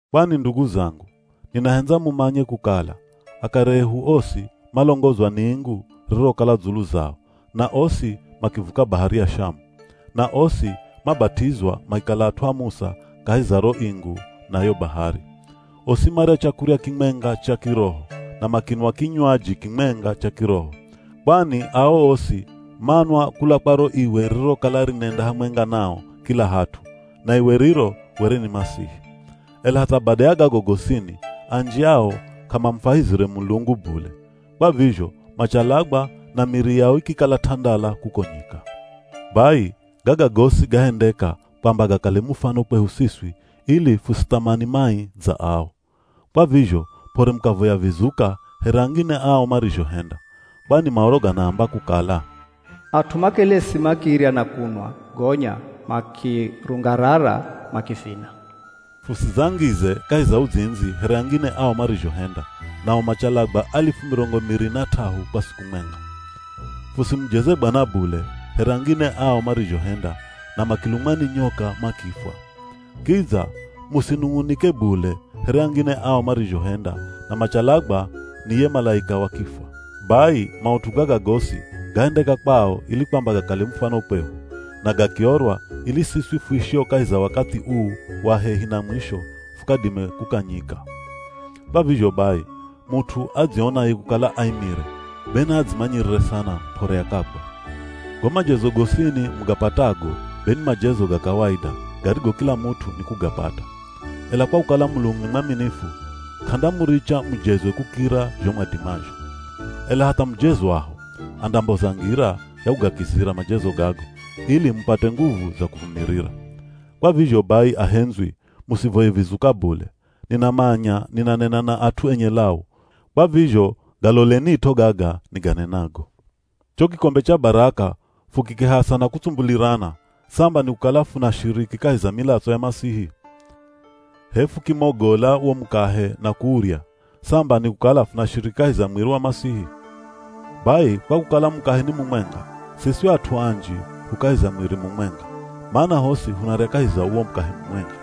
Kwani ndugu zangu, ninahendza mumanye kukala, akare ehu osi malongozwa ni ingu ririrokala dzulu zao, na osi makivuka Bahari ya Shamu. Na osi mabat'izwa makikala at'u a Musa kahi za ro ingu na yo bahari. Osi marya chakurya kimwenga cha kiroho, na makinwa kinywaji kimwenga cha kiroho. Kwani ao osi manwa kula kwa ro iwe ririrokala rinenda hamwenga nao kila hat'u, na iwe riro were ni Masihi. Ela hatha bada ya gago gosini anji ao k'amamufwahizire Mulungu bule, kwa vizho machalagwa na miri yao ikikala t'andala kuko nyika. Bai, gaga gosi gahendeka kwamba gakale mufano kwehu siswi ili fusithamani mai dza ao. Kwa vizho p'ore mukavoya vizuka here angine ao marizhohenda. Kwani Maoro ganaamba kukala, “At'u makelesi makirya na kunwa gonya makirungarara makivina.” Fusidzangize kahi za uzindzi here angine ao marizhohenda, nao machalagwa alifu mirongo miri na t'ahu kwa siku mwenga. Fusimujeze Bwana bule here angine ao marizhohenda na makilumwa ni nyoka makifwa. Kidza musinung'unike bule here angine ao marizhohenda na machalagwa ni ye malaika wa kifwa. Bai, maut'u gaga gosi gahendeka kwao ili kwamba gakale mufano kwehu, na gakiorwa ili siswi fuishio kahi za wakathi uu wa hehi na mwisho fukadime kukanyika. Kwa vizho bai, mut'u adzionaye kukala aimire, be naadzimanyirire sana p'ore akagwa. Go majezo gosini mugapatago be ni majezo ga kawaida, garigo kila mut'u nikugapata. Ela kwa kukala Mulungu ni mwaminifu, k'andamuricha mujezwe kukira zho mwadimazho. Ela hatha mujezwaho andamboza ngira ya kugakizira majezo gago, ili mupate nguvu za kuvumirira. Kwa vizho bai ahendzwi musivoye vizuka bule. Ninamanya ninanena na at'u enye lau, kwa vizho galolenit'o gaga niganenago. Cho kikombe cha baraka fukikihasa na kutsumbulirana, samba nikukala funashiriki kahi za milatso ya Masihi? H'e fukimogola wo mukahe na kuurya, samba nikukala funashiriki kahi za mwiri wa Masihi? Bai kwa kukala mukahe ni mumwenga, siswi at'u anji hu kahi za mwiri mumwenga, mana hosi hunarya kahi za uwo mukahe mumwenga.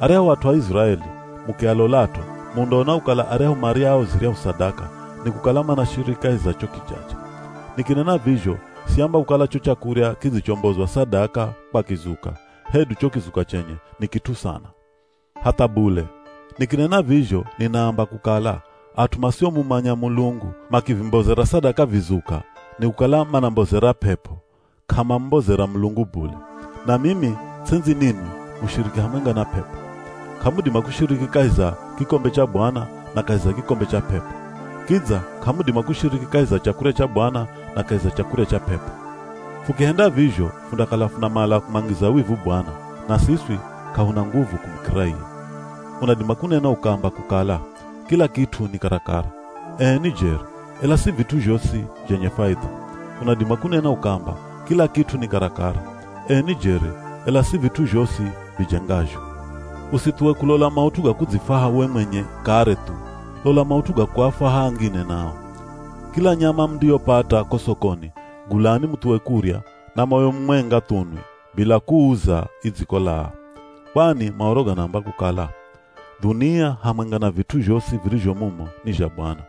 Aryahu at'u a Iziraeli, mukialolat'o, mundaona kukala aryahu maryao ziryahu sadaka, nikukala manashiriki kahi za cho kijaja. Nikinena vizho siamba kukala cho chakurya kidzichombozwa sadaka kwa kizuka, hedu cho kizuka chenye, ni kit'u sana. Hatha bule. Nikinena vizho ninaamba kukala, at'u masiomumanya Mulungu makivimbozera sadaka vizuka nikukala manambozera p'ep'o, k'amamumbozera Mulungu bule. Na mimi ts'endzi ninwi mushiriki hamwenga na p'ep'o. K'amudima kushiriki kahi za kikombe cha Bwana na kahi za kikombe cha p'ep'o. Kidza k'amudima kushiriki kahi za chakurya cha Bwana na kahi za chakurya cha p'ep'o. Fukihenda vizho fundakala funamala kumwangiza wivu Bwana, na siswi k'ahuna nguvu kumukira iye. Unadima kunena ukaamba kukala, “Kila kit'u ni karakara.” Ee ni jeri, ela si vit'u zhosi zhenye faidha. Unadima kunena ukaamba, “Kila kit'u ni karakara.” Ee ni jeri, ela si vit'u zhosi vijengazho. Usithuwe kulola maut'u ga kudzifwaha we mwenye kare thu, lola maut'u ga kuafwaha angine nao. Kila nyama mundiyopata ko sokoni gulani muthuwe kurya na moyo mumwenga thu nwi, bila kuuza idzikolaa. Kwani Maoro ganaamba kukala, “Dhunia hamwenga na vit'u zhosi virizho mumo ni zha Bwana.”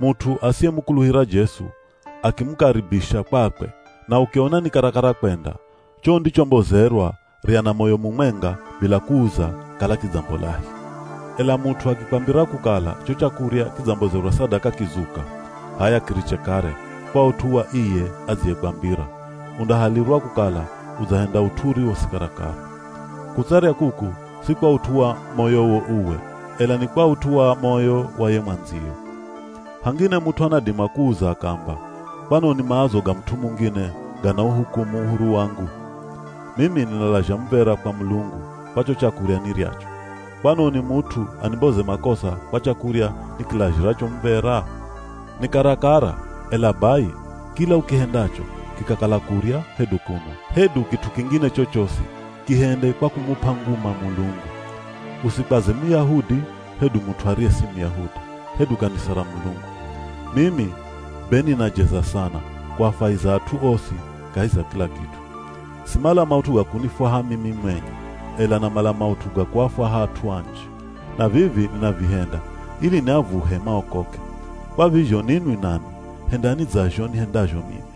Mut'u asiyemukuluhira Jesu akimukaribisha kwakwe, na ukiona ni karakara kwenda, cho undichombozerwa rya na moyo mumwenga bila kuuza kala kidzambolahi. Ela mut'u akikwambira kukala cho chakurya kidzambozerwa sadaka kizuka, h'aya kiriche kare kwa ut'u wa iye adziyekwambira, undahalirwa kukala udzahenda ut'u uriwo si karakara. Kutsarya kuku si kwa ut'u wa moyowo uwe, ela ni kwa ut'u wa moyo wa ye mwandziyo. Hangine mut'u anadima kuuza akaamba, “Kwanoni maazo ga mut'u mungine ganauhukumu uhuru wangu? Mimi ninalazha muv̱era kwa Mulungu kwa cho chakurya niryacho. Kwanoni mut'u animboze makosa kwa chakurya nikilazhiracho muv̱era?” Ni karakara, ela bai, kila ukihendacho, kikakala kurya, hedu kunwa, hedu kit'u kingine chochosi, kihende kwa kumup'a nguma Mulungu. Usikwaze Muyahudi, hedu mut'u ariye si Muyahudi, hedu kanisa ra Mulungu. Mimi be ninajeza sana kuafwahiza at'u osi kahi za kila kit'u. Simala maut'u ga kunifwaha mimi mwenye, ela namala maut'u ga kuafwaha at'u anji. Na vivi ninavihenda ili niavuhe maokoke. Kwa vizho ninwi nanwi hendani dza zho nihendazho mimi.